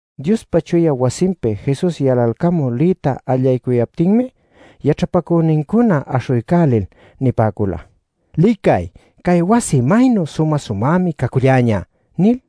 Diospa chuya wasinpi Jesus yalalcamul liyta allaycuyaptinmi, yaćhapacünincuna aśhuycälil nipäcula “Licay, cay wasi maynu sumä-sumämi caculläñä” nil.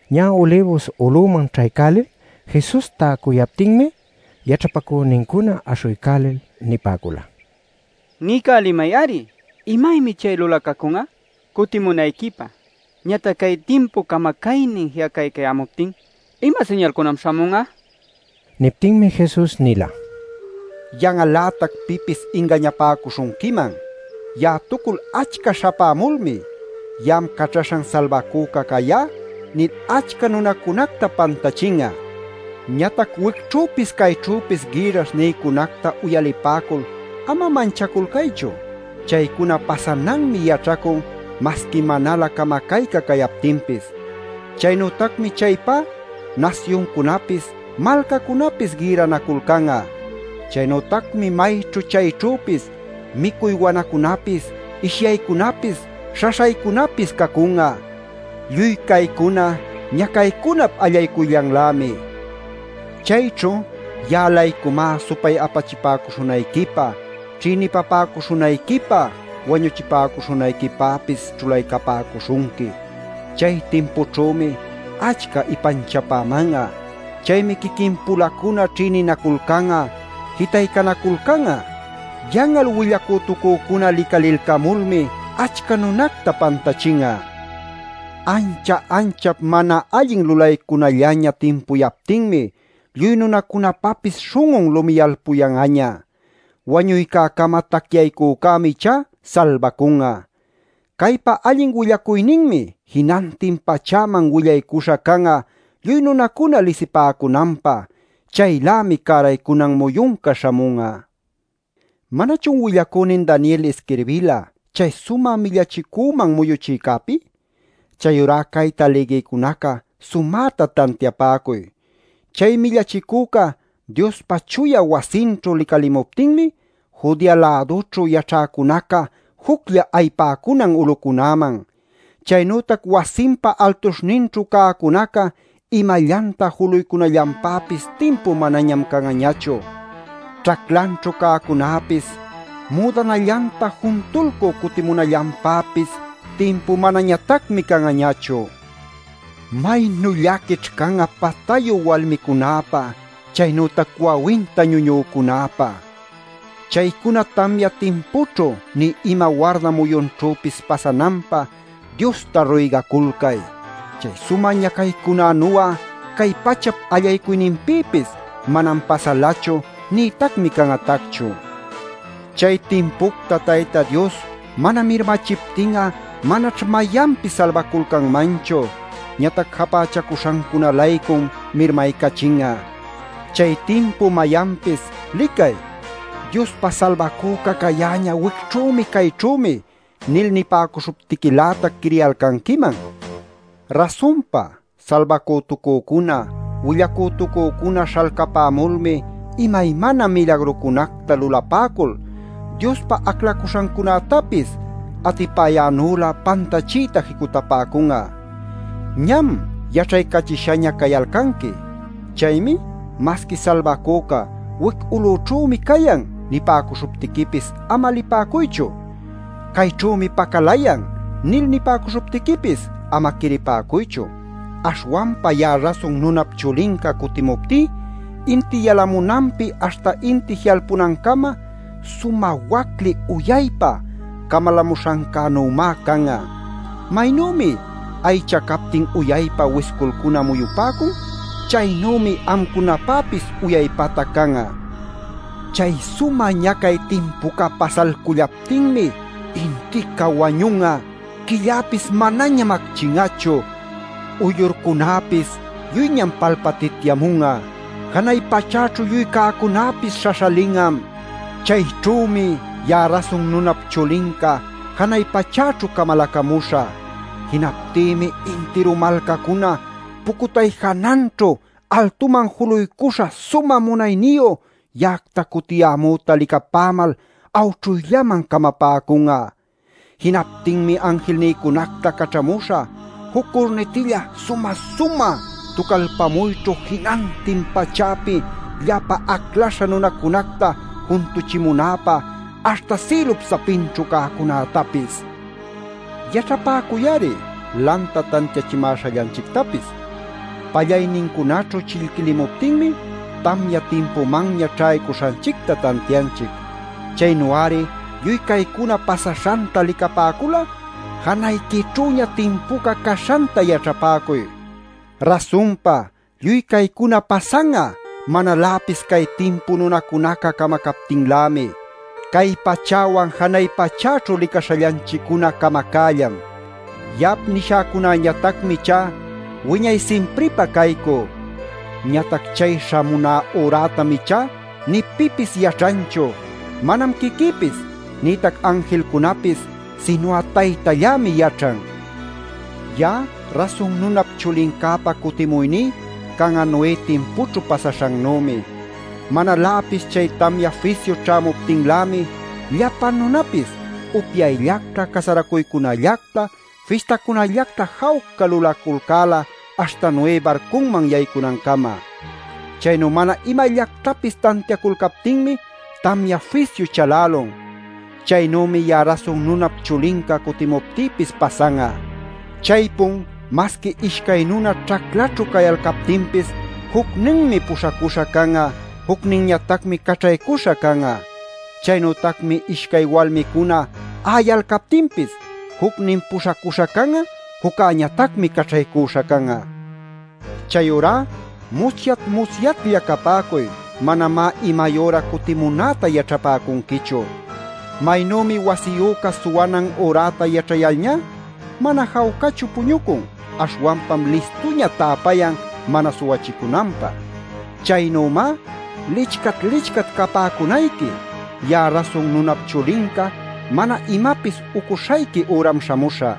Ñä Ulibus ulüman ćhaycälil Jesus täcuyaptinmi, yaćhapacünincuna aśhuycälil nipäcula: “Niycälimay-ari ¿imaymi chay lulacacun'a? Cutimunayquipä ñatac cay timpup camacaynin ji'acaycayämuptin ¿ima siñalcunam śhamun'a?” nil. Niptinmi Jesus nila: “Yan'al-lätac pipis ingañapäcuśhunquiman. Ya'atucul achca śhapämulmi ‘Ya'am Caćhaśhan Salbacüca cayá’ nil achca nunacunacta pantachin'a. Ñatac wicćhüpis cayćhüpis gïrrash nïcunacta uyalipäcul ama manchaculcaychu. Chaycuna pasananmi yaćhacun masqui manalä camacayca cayaptinpis. Chaynütacmi chaypá nasyuncunapis malcacunapis gïrranaculcan'a. Chaynütacmi mayćhu chayćhüpis micuy wanacunapis ishyaycunapis śhaśhaycunapis cacun'a. Lluy caycuna ñacaycunap allaycuyllanlämi. “Chayćhu ya'a-laycumá supay-apachipäcuśhunayquipä ćhïnipapäcuśhunayquipä wañuchipäcuśhunayquipäpis ćhulaycapäcuśhunqui. Chay timpućhümi achca ipanchapäman'a. Chaymi quiquin-pulacuna ćhïninaculcan'a, jitaycanaculcan'a. Yan'al willacütucücuna licalilcamulmi achca nunacta pantachin'a. Ancha-anchap mana allin lulaycunallaña timpuyaptinmi, lluy nunacunapapis śhun'un lumiyalpuyan'aña. Wañuycäcama tacyaycücämi ichá salbacun'a. Caypa allin willacuyninmi jinantin pachäman willaycuśha can'a lluy nunacuna lisipäcunanpä. Chaylämi cäraycunan muyunca śhamun'a. “¿Manachun willacünin Daniel isquirbila chay Sumä Millachicüman Muyuchïcäpi? Chayurá cayta lïgïcunaca, sumäta tantiapäcuy. Chay Millachicüca Diospa chuya wasinćhu licalimuptinmi, Judea-lädućhu yaćhäcunaca juclla ayipäcunan ulucunäman. Chaynütac wasinpa altuśhninćhu cäcunaca imallanta juluycunallanpäpis timpu manañam can'añachu. Ćhaclanćhu cäcunäpis müdanallanta juntulcü cutipämunallanpäpis timpu manañatacmi can'añachu. ¡Maynu llaquićh can'a patayu walmicunäpä, chaynütac wawinta ñuñücunäpä! Chaycuna tamya timpućhu nï ima warda muyunćhüpis pasananpä Diosta ruygaculcay. Cay sumä ñacaycunänu'a cay pachap allaycuyninpïpis manam pasalachu, nïtacmi can'atacchu. Chay timpucta Tayta Dios mana mirmachiptin'a manaćh mayanpis salbaculcanmanchu; ñatac japächacuśhancuna-laycum mirmaycachin'a. “Chay timpu mayanpis ‘¡Licay! ¡Diospa Salbacüca cayäñä wicćhümi, cayćhümi!’ nil nipäcuśhuptiquilätac, quiriyalcanquiman. Rasunpa salbacütucücuna willacütucücuna śhalcapämulmi imaymana milagrucunacta lulapäcul Diospa aclacuśhancunätapis atipayänülä pantachiyta jicutapäcun'a. Ñam yaćhaycachishaña cayalcanqui. “Chaymi masqui ‘Salbacüca wic ulućhümi cayan’ nipäcuśhuptiquipis ama lipäcuychu. ‘Cayćhümi pacalayan’ nil nipäcuśhuptiquipis ama quiripäcuychu. Aśhwanpa ya'a Rasun Nunap Chulinca cutimuptí inti yalamunanpi aśhta inti ji'alpunancama, sumä wacli uyaypa camalämuśhancänümá can'a. Maynümi aycha captin uyaypa wisculcuna muyupäcun; chaynümi amcunapäpis uyaypatac can'a. Chay sumä ñacay timpuca pasalcullaptinmi intica wañun'a; quillapis manañam acchin'achu; uyllurcunapis lluyñam palpatityamun'a; janay pachäćhu lluy cäcunäpis śhaśhalin'am. “Chayćhümi ya'a Rasun Nunap Chulinca janay pachäćhu camalacamuśhä. Jinaptïmi intiru malcacuna pucutay jananćhu altuman juluycuśha sumä munayniyu ya'acta cutiyämüta licapämal awćhuyllaman camapäcun'a. Jinaptinmi anjilnïcunacta caćhamuśha juc curnitilla sumä-sumä tucalpamuyćhu jinantin pachäpi llapa aclaśha nunäcunacta juntuchimunäpä aśhta sïlup sapinćhu cäcunätapis. “Yaćhapäcuy-ari lanta tantiachimäśhallanchictapis. Pallaynincunaćhu chillquilimuptinmi tamya timpumanña ćhaycuśhanchicta tantianchic. Chaynu-ari lluy caycuna pasaśhanta licapäcul'a janayquićhüña timpuca caśhanta yaćhapäcuy. Rasunpa lluy caycuna pasan'a manaläpis cay timpu nunacunaca camacaptinlämi. Cay pachäwan janay pachäćhu licaśhallanchiccuna camacällam. Ya'ap nishäcunañatacmi ichá wiñay simpripä caycü. “Ñatac chay śhamuná ürätam ichá nï pipis yaćhanchu. Manam quiquïpis nïtac anjilcunapis sinu'a Taytallämi yaćhan. Ya'a Rasun Nunap Chulincäpa cutimuyní can'a Noé timpućhu pasaśhannümi. Manaläpis chay tamya fisyu ćhämuptinlämi llapa nunapis upyayllacta, casaracuycunallacta, fistacunallacta jawca lulaculcäla aśhta Noé barcunman yaycunancama. Chaynu mana imallactapis tantiaculcaptinmi tamya fisyu chalälun. Chaynümi ya'a Rasun Nunap Chulinca cutimuptïpis pasan'a. Chaypun masqui ishcay nuna ćhaclaćhu cayalcaptinpis jucninmi puśhacuśha can'a, jucninñatacmi caćhaycuśha can'a. Chaynütacmi ishcay walmicuna a'ayalcaptinpis jucnin puśhacuśha can'a, juccäñatacmi caćhaycuśha can'a. “Chayurá musyat-musyatlla capäcuy; manamá imay üra cutimunäta yaćhapäcunquichu. Maynümi wasiyüca suwanan üräta yaćhayalñá, mana jawcachu puñucun, aśhwanpam listuña täpayan mana suwachicunanpä. Chaynümá licchat-licchat capäcunayqui. Ya'a Rasun Nunap Chulinca mana imapis ucuśhayqui üram śhamuśhä.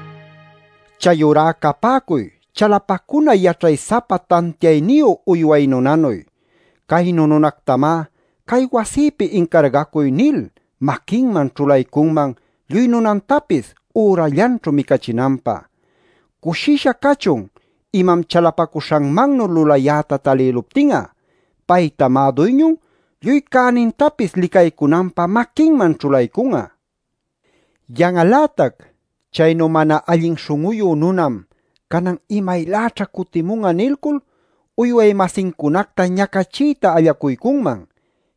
“Chayurá capäcuy chalapacuna yaćhay-sapa tantiayniyu uyway nunanuy. Caynu nunactamá ‘cay wasïpi incargacuy’ nil maquinman ćhulaycunman lluy nunantapis ürallanćhu micachinanpä. Cushisha cachun imam chalapacuśhanmannuy lulayäta talïluptin'a. Paytamá duyñun lluy cänintapis licaycunanpä maquinman ćhulaycun'a. Yan'al-lätac chaynu mana allin śhun'uyu nunan ‘canan imayläćha cutimun'a’ nilcul uyway-masincunacta ñacachiyta allacuycunman.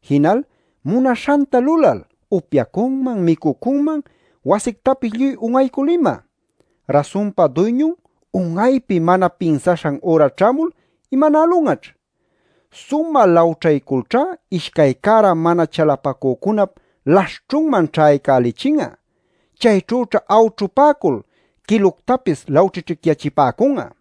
Jinal munaśhanta lulal upyacunman micucunman wasictapis lluy un'aycul ima. Rasunpa duyñun un'aypi mana pinsaśhan üra ćhämul, ¿imanälun'aćh? Sumä lawćhayculćhá ishcay cära mana chalapacücunap laśhćhunman ćhaycälichin'a. Chayćhüćha awćhupäcul quiluctapis lawćhićhicyachipäcun'a.